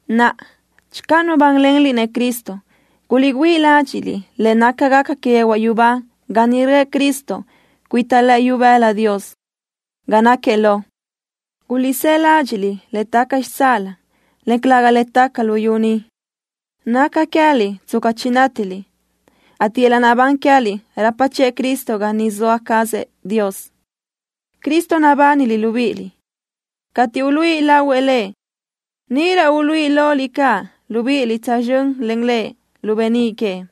Naʼa, channö nubánlenliʼ-nëʼ Cristo, guliʼgüíʼ ladxiʼ le nácagaca que yehuaʼ yubá ga niʼ röʼë Cristo cuita lëʼë ibëla Dios, ga náquiëʼ lo. Guliʼsáʼ ladxiʼ le taca xitsáʼalö, en calëga le taca luyú ni. Naca queë́liʼ tsca chinátiliʼ, ateʼ yöl-laʼ naʼbán queë́liʼ rapa chiʼë Cristo ga niʼ zoa cazëʼ Dios. Cristo nabániliʼ libíʼiliʼ. Cateʼ uluíʼi lahuëʼ Lëʼ, níʼirö uluíʼi loliʼ caʼ libíʼiliʼ tsözxö́n len Lëʼ lu beníʼ queëʼ.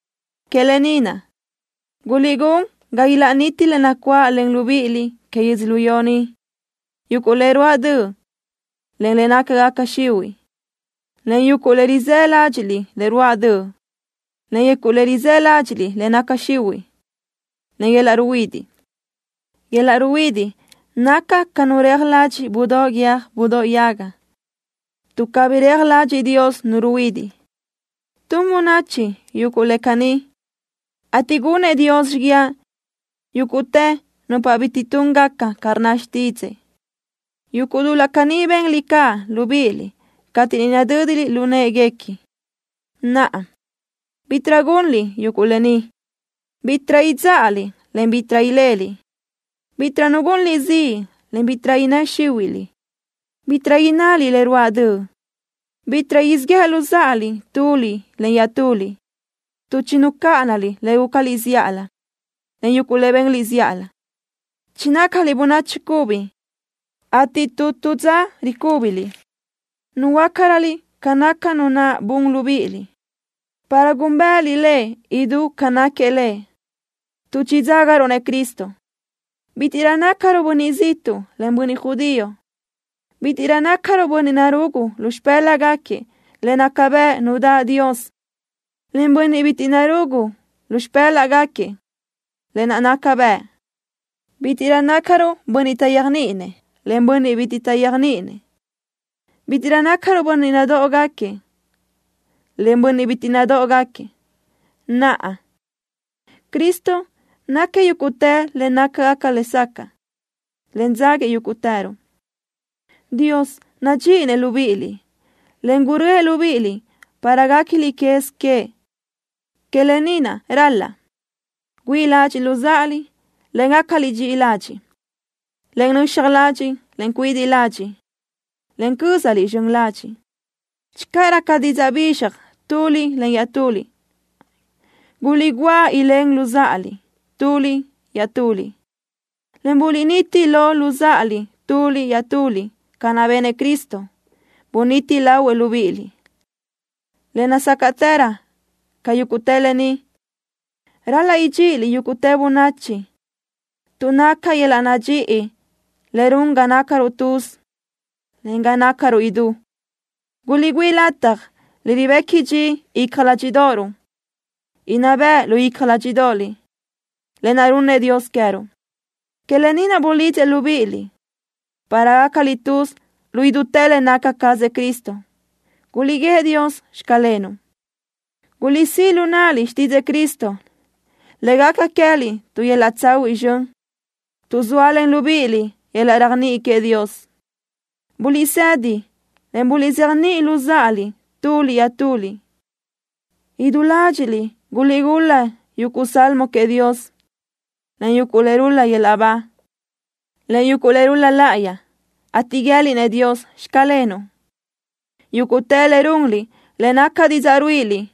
Que lë ni naʼ, guliʼgún ga ilaʼniti le nacuáʼlen libíʼiliʼ que yödzölió ni: Yuguʼ le ruáʼ döʼ, en le nácagaca xihuiʼ, en yuguʼ le rizë́ ládxiʼliʼ le ruáʼ döʼ, en yuguʼ le rizë́ ládxiʼliʼ le naca xihuiʼ, en yöl-laʼ ruhuidiʼ. Yöl-laʼ ruhuidiʼ naca lëbi ca nu reaj ladxiʼ budóʼ guiö́j budóʼ yaga, tuʼ cabí reaj ladxiʼ Dios nu ruhuidiʼ. Tun bönachi yuguʼ le caní, ateʼ gunëʼ Dios xíguiaʼ yúguʼtë nupa bitiʼ túngaca ca rnna xtídzëʼë. Yuguʼ dul-laʼ caní benliʼ caʼ libíʼiliʼ cateʼ niʼ nadö́diliʼ lu në́ʼeguequi. Naʼa, bítiʼrö gunliʼ yuguʼ lë ni: Bítiʼrö idzáʼaliʼ, en bítiʼrö leliʼ. Bítiʼrö nu gunliʼ ziʼ, en bítiʼrö innë́ xíhuiʼliʼ. Bítiʼrö innaliʼ le ruáʼ döʼ. Bitiʼ siʼ yéʼeliʼ luzáʼaliʼ tuliʼ iaʼtuliʼ tuʼ chinucáʼanaliʼ le gúcaliʼ zíʼalö, en yuguʼ le benliʼ zíʼalö. Chinácaliʼ bönachi cubi, ateʼ tu tu dza ricúbiliʼ, ruhuöácaröliʼ ca naca Nu naʼ bun libíʼiliʼ, para gúnbëʼëliʼ Lëʼ idú ca náquiëʼ Lëʼ. Tuʼ chidzágaruʼ-nëʼ Cristo: Bítiʼrö nácaruʼ bönniʼ ziʼtuʼ, en bönniʼ judío. Bítiʼrö nácaruʼ bönniʼ narugu lu xipë́laʼgaquiëʼ le naca bëʼ nu daʼ Dios, en bönniʼ bitiʼ narugu lu xipë́laʼgaquiëʼ lë naʼ naca bëʼ. Bítiʼrö nácaruʼ bönniʼ taʼyéajniʼinëʼ, en bönniʼ bitiʼ taʼyéajniʼinëʼ. Bítiʼrö nácaruʼ bönniʼ nadóʼogaquiëʼ, en bönniʼ bitiʼ nadóʼogaquiëʼ. Naʼa, Cristo náquiëʼ yúguʼtë le nácagaca lesacaʼ, en dzáguiëʼ yúguʼtëruʼ. Dios nadxíʼinëʼ libíʼiliʼ, en gurö́ëʼ libíʼiliʼ para guéquiliʼ quez queëʼ. Que lë ni naʼ, ral-laʼ: Güíʼi ládxiʼliʼ luzáʼaliʼ, en gácaliʼ dxiʼi ladxiʼ, en nöxaj ladxiʼ, en cuidiʼ ladxiʼ, en cö́zaliʼ zxön ladxiʼ. Channö raca didzaʼ bizxaj tuliʼ len iaʼtuliʼ, guliʼguáʼ ilén luzáʼaliʼ tuliʼ iaʼtuliʼ, en buliʼniti lo luzáʼaliʼ tuliʼ iaʼtuliʼ ca naʼ benëʼ Cristo, buniti lahuëʼ libíʼiliʼ. Le nazácaʼtërö ca yúguʼtë lë ni, ral-laʼ idxíʼiliʼ yúguʼtë bönachi, tuʼ naca yöl-laʼ nadxíʼi le run ga nácaruʼ tuz, en ga nácaruʼ idú. Guliʼgüíʼ lataj le ribequi dxi icja ládxiʼdoʼoruʼ inná bëʼ lu icja ládxiʼdoʼoliʼ, lë naʼ runnëʼ Dios queë́ruʼ. Que lë ni naʼ bulidzëʼ libíʼiliʼ, para gácaliʼ tuz lu idútë le naca cazëʼ Cristo. Guliʼguíëʼ Dios: “Xclenuʼ.” Guliʼsíʼ lu náʼaliʼ xtídzëʼë Cristo le gaca queë́liʼ tu yöl-laʼ tsahuiʼ zxön. Tuʼ zóalen libíʼiliʼ yöl-laʼ réajniʼi queëʼ Dios, buliʼsedi, en buliʼzéjniʼi luzáʼaliʼ tuliʼ iaʼtuliʼ. Idú ládxiʼliʼ guliʼgul-la yuguʼ salmo queëʼ Dios, en yuguʼ le rul-la yöl-laʼ ba, en yuguʼ le rul-la láʼayi, ateʼ guië́liʼ-nëʼ Dios: “Xclenuʼ.” Yúguʼtë le runliʼ, le naca didzaʼ ruíʼiliʼ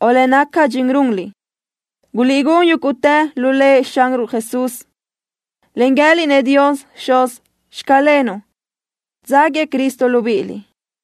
o le naca dxin runliʼ, guliʼgún yúguʼtë lu Lëʼ Xanruʼ Jesús, en guië́liʼ-nëʼ Dios Xuz: “Xclenuʼ”, dzáguiëʼ Cristo libíʼiliʼ.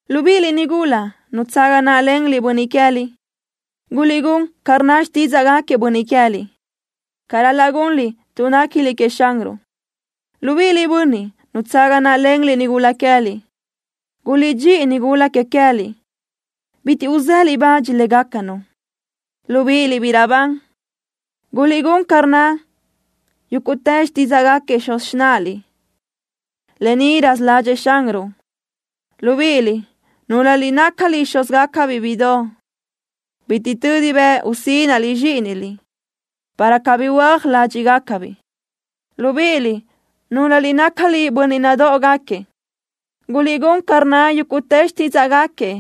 Libíʼiliʼ, nigula nutsaga náʼalenliʼ bönniʼ queë́liʼ, guliʼgún ca rnna xtídzaʼgaquiëʼ bönniʼ que queë́liʼ ca ral-laʼ gunliʼ, tuʼ néquiliʼ queëʼ Xanruʼ. Libíʼiliʼ, bönniʼ nutsaga náʼalenliʼ nigula queë́liʼ, guliʼdxíʼi nigula que queë́liʼ, en bitiʼ uzéliʼ bach légacanu. Libíʼiliʼ, biʼi raʼbán, guliʼgún ca rnna yúguʼtë xtídzaʼgaquiëʼ xuz xináʼaliʼ. Lë ni raza ládxëʼë Xanruʼ. Libíʼiliʼ, núlöliʼ nácaliʼ xúzgaca bíʼidoʼ, bitiʼ tödi bëʼ usínaʼliʼ zxíʼiniliʼ, para cabí huö́aj ládxiʼgacabiʼ. Libíʼiliʼ, núlöliʼ nácaliʼ bönniʼ nadóʼogaquiëʼ, guliʼgún ca rnna yúguʼtë xtídzaʼgaquiëʼ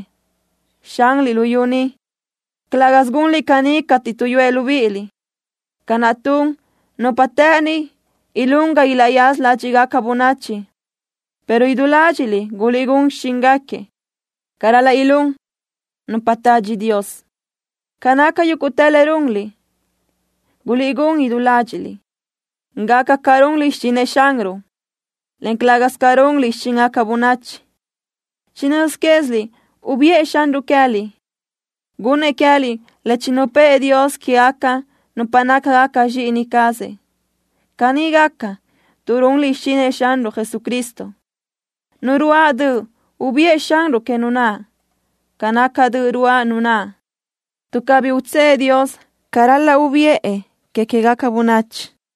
xanliʼ luyú ni. Calë́gasö gunliʼ caní cateʼ tuʼyúëʼ libíʼiliʼ ca naʼ tun nupa të́ʼëni ilún ga ilaʼyaza ládxiʼgaca bönachi, pero idú ládxiʼliʼ guliʼgún xichíngaquiëʼ ca ral-laʼ ilún nupa tadxi Dios. Ca naca yúguʼtë le runliʼ, guliʼgún idú ládxiʼliʼ, gaca ca runliʼ xichinëʼ Xanruʼ, en calë́gasö ca runliʼ xichíngaca bönachi. Chinö́z quéziliʼ ubiʼë Xanruʼ queë́liʼ, gunnëʼ queë́liʼ le chinupë́ʼë Dios quégaca nupa nácagaca zxíʼini cazëʼ. Caní gaca, tuʼ runliʼ xichinëʼ Xanruʼ Jesucristo. Nu ruáʼ döʼ, ubiʼë Xanruʼ que nu naʼ ca naca döʼ ruáʼ nu naʼ, tuʼ cabí utsë́ʼë Dios ca ral-laʼ ubiʼë que queë́gaca bönachi.